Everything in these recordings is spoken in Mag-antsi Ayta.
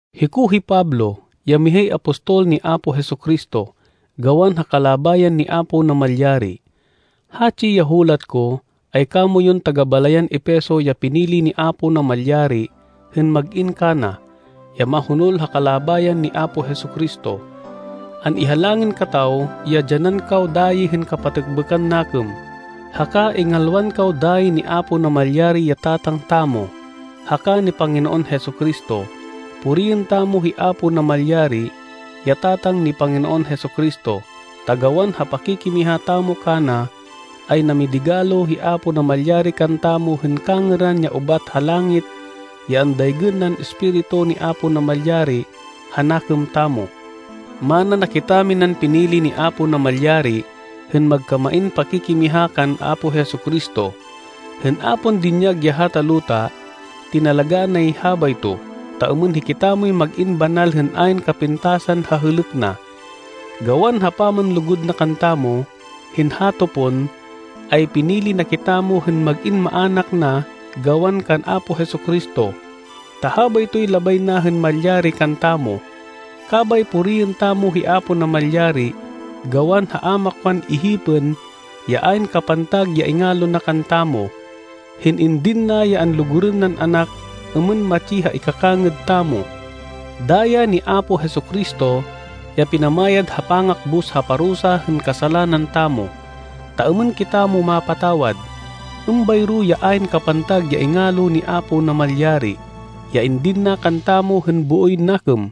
Hiko hi Pablo, ya mihay apostol ni Apo Jesu-Cristo, gawan ha kalabayan ni Apo Namalyari. Hatsi ya hulat ko, ay kamoyun taga-balayan Efeso ya pinili ni Apo Namalyari hên mag-in kana, ya mahonol ha kalabayan ni Apo Jesu-Cristo. An-ihalangin kataw ya dyanan kaw dayi hên kapatêkbêkan nakêm, haka ingalwan kaw dayi ni Apo Namalyari ya Tatang tamo, haka ni Panginoon Jesu-Cristo. Puriên tamo hi Apo Namalyari, ya Tatang ni Panginoon Jesu-Cristo, ta gawan ha pakikimiha tamo kana, ay namidigalo hi Apo Namalyari kantamo hên kangêran ya ubat ha langit ya andaygên nan Espiritu ni Apo Namalyari ha nakêm tamo. Mana na kitaminan pinili ni Apo Namalyari hên magkamain pakikimiha kan Apo Jesu-Cristo, hên a pon dinyag ya hata luta. Tinalagá nay habayto, ta êmên hikitamoy mag-in banal hên ayn kapintasan ha hêlêk na. Gawan ha pamanlugud na kantamo, hên hato pon, ay pinili na kitamo hên mag-in maának na gawan kan Apo Jesu-Cristo, ta habaytoy labay na hên malyari kantamo. Kabay puriên tamo hi Apo Namalyari, gawan ha a makwan ihipên ya ayn kapantag ya ingalo na kantamo, hên indin na ya anlugurên nan Anak êmên matsi ha ikakangêd tamo. Daya ni Apo Jesu-Cristo, ya pinamayad ha pangakbus ha parusa hên kasalanan tamo, ta êmên kitamo mapatawad. Êmbayro ya ayn kapantag ya ingalo ni Apo Namalyari ya indin na kantamo hên booy nakêm.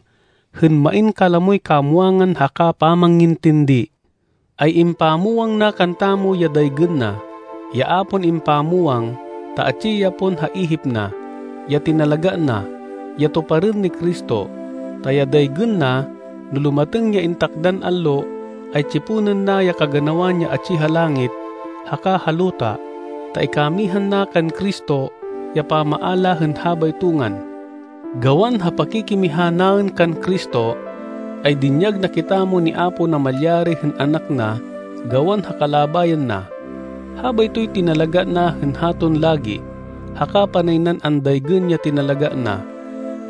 Hên main kalamoy kamwangan haka pamangintindi, ay impamwang na kantamo ya daygên na, ya a pon impamwang, ta atsi ya pon ha ihip na, ya tinalagá na, ya tuparên ni Cristo. Ta ya daygên na, no lumatêng ya intakdan allo, ay tsiponên na ya kaganawan ya atsi ha langit, haka ha luta, ta ikamihan na kan Cristo, ya pamaala hên habayto ngan. Gawan ha pakikimiha naên kan Cristo, ay dinyag na kitamo ni Apo Namalyari hên anak na gawan ha kalabayan na. Habaytoy tinalagá na hên haton lagi, haka panay nan andaygên ya tinalagá na.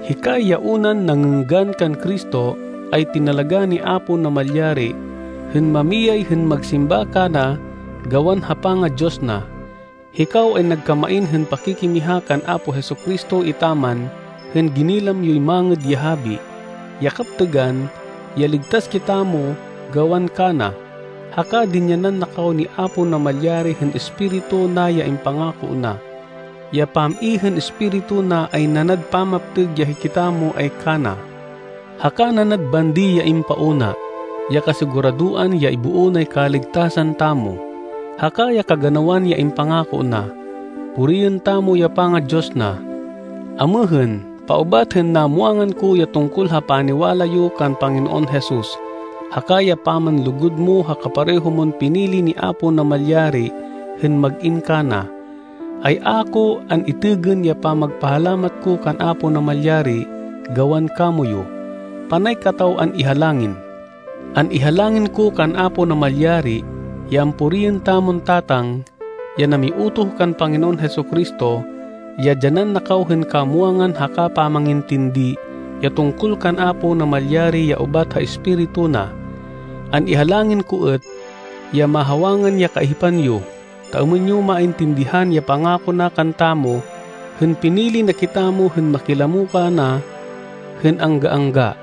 Hikay ya unan nangênggan kan Cristo, ay tinalagá ni Apo Namalyari hên mamiyay hên magsimba kana gawan ha panga-Diyos na. Hikaw ay nagkamain hên pakikimiha kan Apo Jesu-Cristo etaman hên ginilam yoy Mangêd ya Habi, ya kaptêgan, ya ligtas kitamo gawan kana. Haka dinyanan na kaw ni Apo Namalyari hên Espiritu na ya impangako na. Ya pam-i hên Espiritu na ay nanad pamaptêg ya hikitamo ay kana, haka nanad bandi ya impauna, ya kasiguradoan ya iboo nay kaligtasan tamo, haka ya kaganawan ya impangako na. Puriên tamo ya panga-Diyos na. Amêhên, paubat hên namwangan ko ya tungkol ha paniwala yo kan Panginoon Jesus haka ya pamanlugud mo ha kapareho mon pinili ni Apo Namalyari hên mag-in kana, ay a ko an-itêgên ya pamagpahalamat ko kan Apo Namalyari gawan kamoyu. Panay kataw an-ihalangin. An-ihalangin ko kan Apo Namalyari ya ampuriên tamon Tatang, ya namiutoh kan Panginoon Jesu-Cristo, ya dyanan na kaw hên kamwangan haka pamangintindi ya tungkol kan Apo Namalyari ya ubat ha Espiritu na. An-ihalangin ko êt ya mahawangan ya kaihipan yo, ta êmên yo maintindihan ya pangako na kantamo hên pinili na kitamo hên makilamo kana hên angga-angga.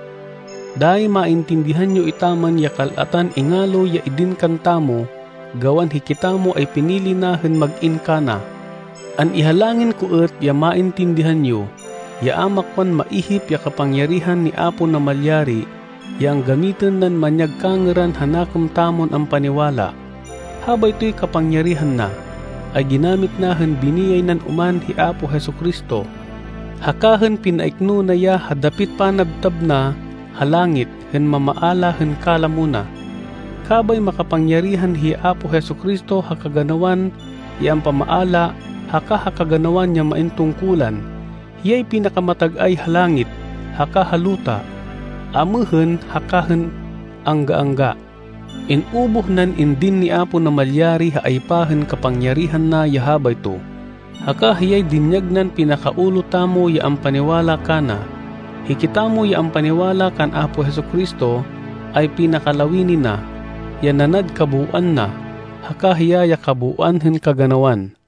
Dayi maintindihan yo etaman ya kal-atan ingalo ya idin kantamo gawan hikitamo ay pinili na hên mag-in kana. An-ihalangin ko êt ya maintindihan yo, ya a makwan maihip ya kapangyarihan ni Apo Namalyari ya anggamitên nan manyag kangêran ha nakêm tamon ampaniwala. Habaytoy kapangyarihan na, ay ginamit na hên biniyay nan oman hi Apo Jesu-Cristo, haka hên pinaikno na ya ha dapit panabtab na ha langit hên mamaala hên kalamo na. Kabay makapangyarihan hi Apo Jesu-Cristo ha kaganawan ya ampamaala haka ha kaganawan ya main tungkulan. Hiyay pinakamatag-ay ha langit haka ha luta amêhên haka hên angga-angga. In-ubuh nan indin ni Apo Namalyari ha aypa hên kapangyarihan na ya habayto, haka hiyay dinyag nan pinaka-ulo tamo ya ampaniwala kana. Hikitamo ya ampaniwala kan Apo Jesu-Cristo, ay pinakalawini na, ya nanad kabooan na. Haka hiya ya kabooan hên kaganawan.